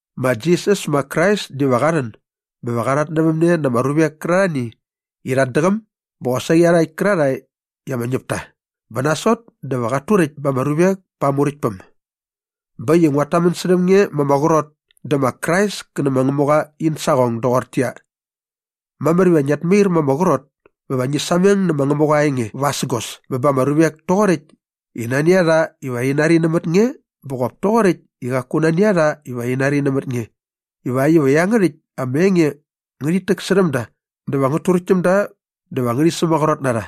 Ma Jisas ma Krais diva qa rhän bä va qa rhatnävämne na ama ruvek kärarhani i rhat däqäm bä qosaqi iarhakt kärarhae i ama ñäp ta bä nasot dä va qat turäkt ba ama ruvek pa aa Muräktpäm. Bä äkt i nguat tamän särhäm nge ma ama qrot dä ma Krais kä nä ma Ngämuqa in saqong doqortäqyia, mamär iva ngiat mair ma ama qrot bä va ngi sameng nä ma Ngämuqa aa enge vasägos bä ba ama ruvek toqoräkt i nani a rha iva rhi nari nämät nge bä qop toqoräkt i qaku nani a rha iva rhi nari nämät nge ivakt iva iangärhäkt ama enge ngärhit täksärhäm da dä va ngät turäkt täm da dä va ngärhi sämaqrot na rha.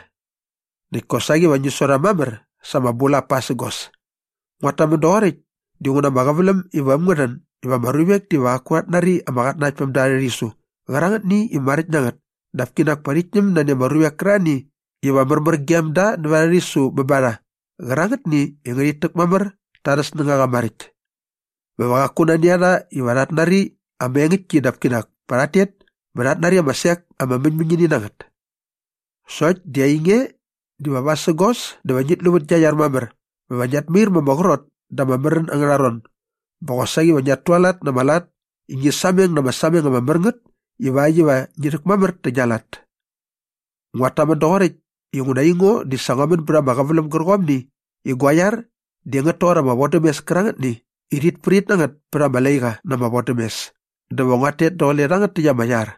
Näkt kosaqi va ngi su rha mamär sa ama bulap pasägos. Nguat tamän doqoräkt dinguna ama qäväläm iva äm ngä rhän iva ama ruvek diva qaku rhat nari ama qatnanaktpämda arhä rhisu qärangätni i maräkt na ngät dap kinak pa rhit ñäm nani ama ruvek kärarhani iva märmär gem da nävät arhä rhisu bä ba rha qärangätni i ngärhit täk mamär ta arhä snängaqa maräkt. Bä va qaku nani a rha iva rhat nari ama engäktki dap kinak pa rhat tet bä rhat nari ama sek ama mäñmäñini na ngät. Sokt di ainge diva vasägos dä va ngit lu vät gia iar mamär bä va ngiat mair ma ama qrot da ama märän angärha ron bä qosaqi va ngiat tualat na ama lat i ngi sameng na ama sameng ama mär ngät ivakt iva ngi rhäkmamär nä gia lat. Nguat tamän doqoräkt inguna aingo di sa ngua män bät ama qäväläm gärqomni i gua iar di ngät toqor ama vodämes kärangätni i rhit prit na ngät pät ama laiqa na ama vodämes dä va nguat tet daqule rhangät täkt ama iar.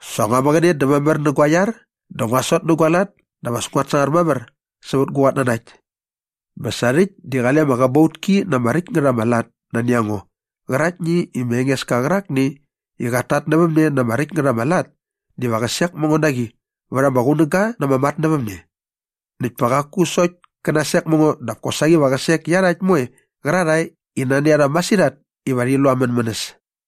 Sa ngua mäqäne dä mamär nä gua iar dä ngua sot nä gua lat dap as nguat sangar mamär sävät gu qatnanakt. Bä sa rhäkt di qale ama qäbautki na ama räkt ngät ama lat nani a ngo qäraktni i ma Engeska qärakni i qat tatnävämne na ama räkt ngät ama lat diva qä sek mä ngo na qi vät ama qunäga na ama matnävämne. Näkt pa qaku sokt kä nasek mä ngo dap kosaqi va qä sek iarhakt moe qärarhae i nani a rha masirhat iva rhi lu aa mänmänäs.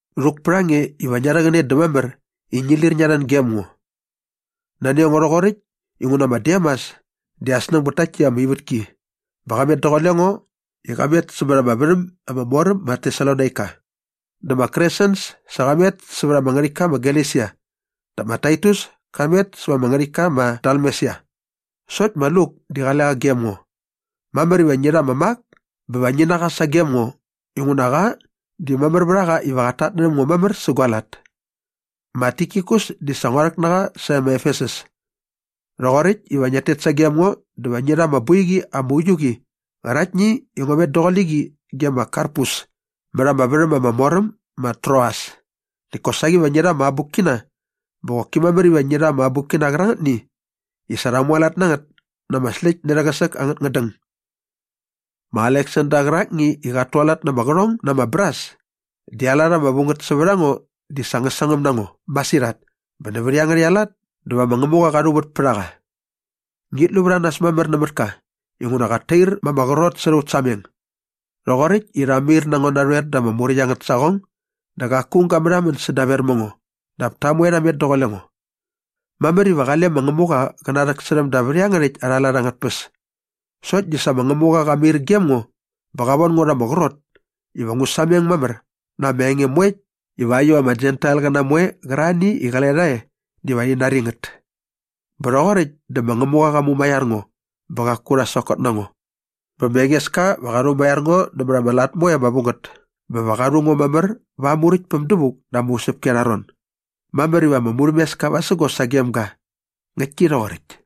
Rhuk pät a nge iva ngia rhäqäne dä mamär i ngi lir ngia rhän gem ngo. Nani a ngo rhoqoräkt inguna ma Demas di aa snäng bät takt täkt ama ivätki bä qa met daqule ngo i qa met sämät ama värhäm ama mor äm ma Tesalonaika. Dä ma Kresens sa qa met sävät ama ngärhäktka ma Galesia dä ma Taitus ka met sävät ama ngärhäktka ma Dalmesia. Sokt ma Luk di qale qa gem ngo. Mamär iva ngi rha ma Mak bä va ngi na qa sagem ngo inguna qa di mamär vät a qa iva qat tatnärhäm ngo mamär sä gua lat. Ma Tikikus di sa ngua rhäk na qa sae ma Efesus. Rhoqoräkt iva ngiat tet sagem ngo dä va ngi rha ama boiqi ama uiu qi qäraktni i ngua met daqule qi ge ma Karpus mät ama värhäm ama mor äm ma Troas näkt kosaqi va ngi rha ama abukkina bä qoki mamär iva ngi rha ama abukkina kärangätni i sa rha mualat na ngät na ama släkt nä rhäqäsäk angät ngädäng. Ma Aleksander qärakni i qat tualat na ama qärhong na ama bras di aa lat ama vu ngät sävät a ngo di sa ngä sangäm na ngo masirhat bä nävät iangärhäkt aa lat dä va ma Ngämuqa qa rhuvät pät a qa. Ngit lu vät a nas mamär nämät ka inguna qat tair ma ama qrot särha aut sameng. Rhoqoräkt i rha mair na ngo narhoer da ama muräkt angät saqong dä qaku aung ga märhamän sädaver mä ngo dap ta moe rha met daqule ngo. Mamär iva qale ma Ngämuqa qä narhäksärhäm da vät iangärhäkt arha lat angät tpäs. Sokt di sa ma Ngämuqa qa mair gem ngo bä qa von ngo rha ama qrot iva ngu sameng mamär na ama enge moe ivakt iva ama Jentailqäna moe qärarhani i qale rha e diva rhi nari ngät. Bä rhoqoräkt dä ma Ngämuqa qa mumaiar ngo bä qaku rha sokot na ngo. Bä ma Engeska va qa rhumaiar ngo nämät ama lat moe ama vu ngät bä va qa rhu ngo mamär va aa Muräktpäm dävuk da ama usäpki arha ron. Mamär iva ama murhämeska vasägos sagem ga. Ngäktki rhoqoräkt.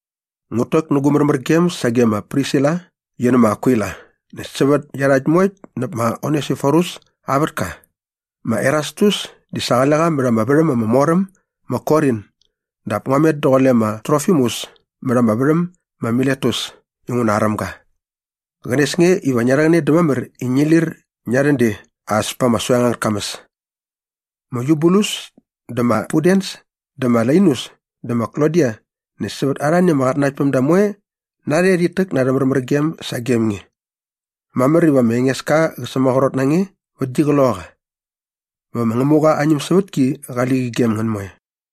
Ngut täk nä gu märmärgem sage ma Prisila qi nä ma Akwila näkt sävät iarhakt moekt näp ma Onesiforus aa vätka. Ma Erastus di sa qale qa mät ama värhäm ama mor äm ma Korin dap ngua met daqule ma Trofimus mät ama värhäm ma Miletus inguna aräm ga. Qänes nge iva ngia rhäqäne dä mamär i ngi lir ngia rhän de as pa ama soeng angät kamäs. Ma Yubulus dä ma Pudens dä ma Lainus dä ma Klodia näkt sävät arhani ama qatnanaktpämda moe narhe rhit täk na arhä märmärgem sagem nge. Mamär iva ma Engeska qä sämaqrot na nge vät gi qloqaqa. Bä va ma Ngämuqa aa ñämsävätki qali qi gem ngän moe.